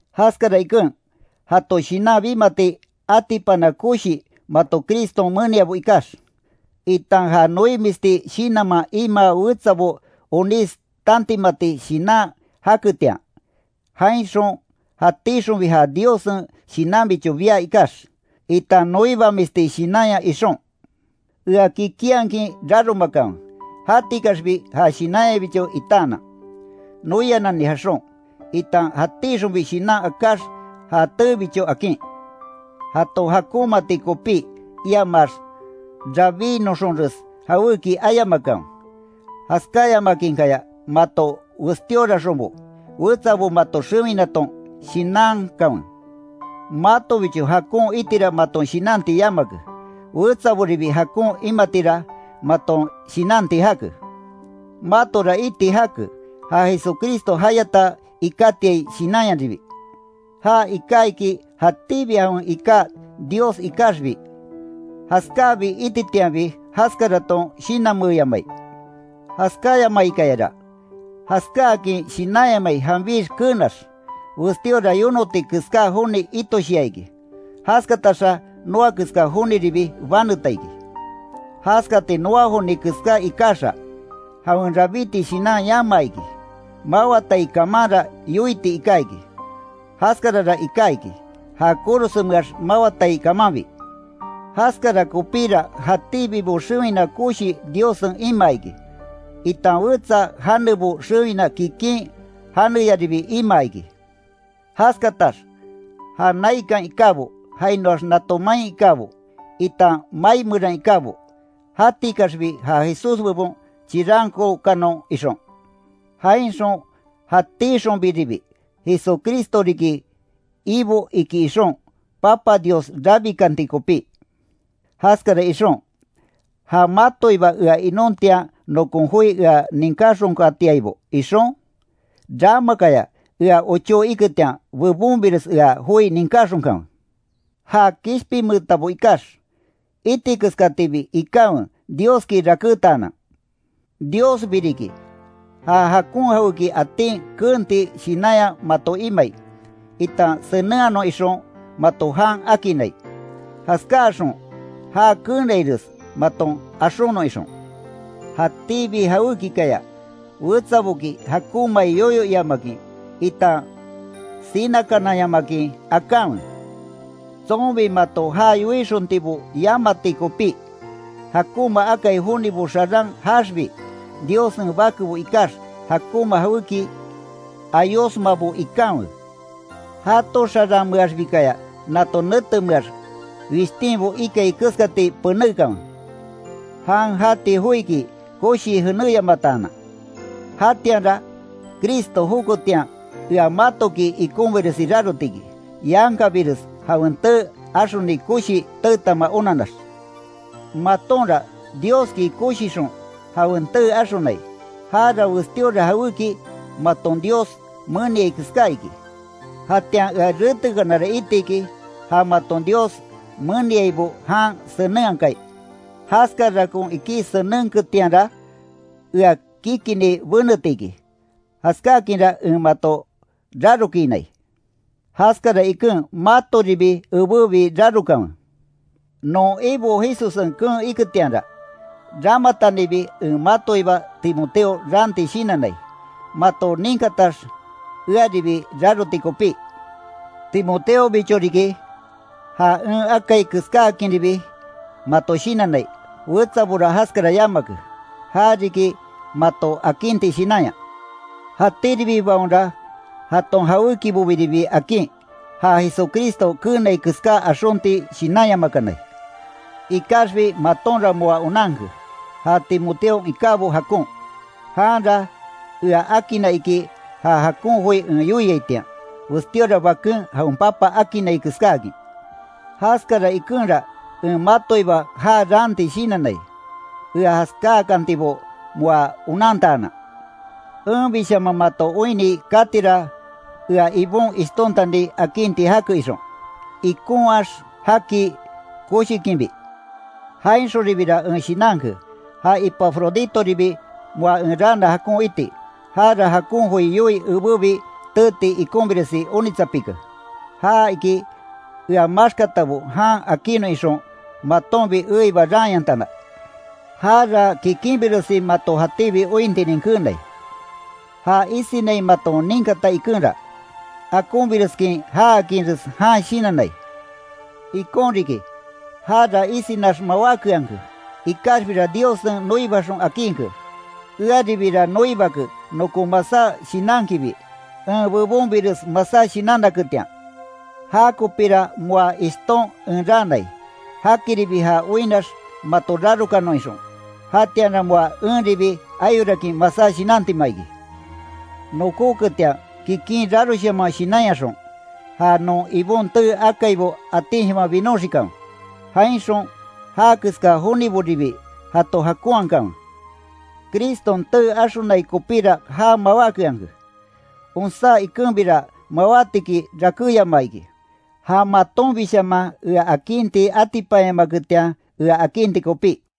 Jaskara iken, jato shinan bimati atipana koshi mato Criston meniabo ikax, itan ja noimisti shinanman imaa wetsabo onís tantimati shinan jaketian, jainxon jatíxonbi ja Diossen Shinanbicho bia ikax, itan noibamisti shinanya ixon, ea kikinhakin raromakanwe, jatikaxbi ja shinanyabicho itaanan, noianani jaxon, itan jatíxonbi shinan akáx ja teebicho akin. Jato jakonmaati kopí, iamax rabínoxonres jawéki ayamakanwe. Jaskáyamakinkaya mato westíoraxonbo, wetsabo mato xewinaton shinankanwe. Matobicho jakon itira maton shinanti yamake, wetsaboribi jakon imatira maton shinanti jake. Matora iti jake, ja Jesucristo jayata ikátiai shinanyaribi. Já iká iki jatíbi jawen iká Dios ikaxbi, jaskábi ititianbi jaskaraton shinanmeeyamai. Jaskáyamaikayara, jaskáakin shinanyamai janbix keenax, westíora yonoti keská joni itoshia iki. Jaskataxa noa keska joniribi baneta iki. Jaskati noa joni keska ikaxa, jawen rabíti shinan yamaa iki. Mawatai kamanra yoiti iká iki. Jaskarara iká iki, ja korosenmeax mawatai kamanbi. Jaskara kopíra jatíbibo xewina koshi Diossen imaa iki, itan wetsa janebo xewina kikin janeyaribi imaa iki, jaskatax ja naikan ikábo, jainoax nato main ikábo, itan mai meran ikábo, jatikaxbi ja Jesús bebon chirankookanon ixon. Jainxon jatixonbiribi, Jesucristo riki Ibo iki ixon, Papa Dios rabikanti kopí. Jaskara ixon, ja matoiba ea inontian nokon joi ea ninkáxonkatiaibo ixon, ramakaya ea ochó iketian, bebonbires ea joi ninkáxonkanwe. Ja kishpinmeetabo ikax, iti keskatibi ikanwe Dioski rakétaanan. Diosbi riki ja jakon jawéki atin keenti shinanya mato imai, itan senenhanon ixon mato jan akinnai. Jaskáaxon já keenaires maton axonon ixon. Jatíbi jawékikaya wetsaboki jakonmai yoyo iamakin, itan sinakananyamakin akanwe, tsonbi mato ja yoixontibo yamati kopí. Jakonma akai jonibo xarán jaaxbi, Diossen bakebo ikax jakonma jawéki ayosmabo ikanwe. Jato xaranmeaxbikaya nato netemeax wishtinbo ikai keskati penékanwe, jan jati joiki koshii jenéyamataanan. Jatianra, Cristo joketian ea matoki ikonbiresi raroti iki, yankabires jawen tee axoni koshi teetama onanax. Matonra Dioski koshixon, jawen tee axonai, jara westíora jawéki maton Dios meniai keská iki. Jatian ea retekanara itiki, ja maton Dios meniaibo jan senenhakai. Jaskarakon ikí senenketianra ea kikini beneti iki, jaskákinra en mato rarokinai. Jaskara iken matoribi ebébi rarokanwe. Non Ibo Jesussen keen iketianra, ramatanibi en matoiba Timoteo raanti shinannai, mato ninkatax earibi raroti kopí. Timoteobicho riki, ja en akai keskáakinribi mato shinannai, wetsabora jaskara yamake. Já riki mato akinti shinanya. Jatíribibaonra jaton jawékibobiribi akin, ja Jesucristo keenai keská axonti shinanyamakanai. Ikaxbi matonra moa onanke, ja Timoteon ikábo jakon. Janra ea akinna iki ja jakon joi en yoiaitian, westíora baken jawen papa akinnai keskáakin. Jaskara ikenra en matoiba já raanti shinannai, ea jaskáakantibo moa onantaanan. Enbishaman mato oinni katira ea Ibon ishtontani akinti jake ixon, ikonhaax jaki koshikinbi. Jainxonribira en shinanke, ja Epafroditoribi moa en raana jakon iti. Jara jakon joi yoii ebébi teeti ikonbiresi onitsapike. Ja iki ea maxkatabo jan akinnon ixon, matonbi eiba raanyantana. Jara kikinbiresi mato jatíbi ointinin keenai. Já isinai maton ninkata ikenra, akonbireskin jaakinres jan shinannai. Ikon riki jara isinax mawákeanke, ikaxbira Diossen noibaxon akinke. Earibira noibake nokon masá shinankibi, en bebonbires masá shinannaketian. Jakopira moa ishton en raanai, jakiribi ja oinnax mato rarokanon ixon. Jatianra moa enribi ayorakin masá shinantima iki. Nokóketian kikin raroshaman shinanyaxon, ja non Ibon tee akaibo atinshaman binoxikanwe. Jainxon já keska joniboribi jato jakonhakanwe. Criston tee axonai kopíra já mawákeanke. Onsá ikenbira mawátiki rakéyamaa iki, ja matonbishaman ea akinti atipanyamaketian ea akinti kopí.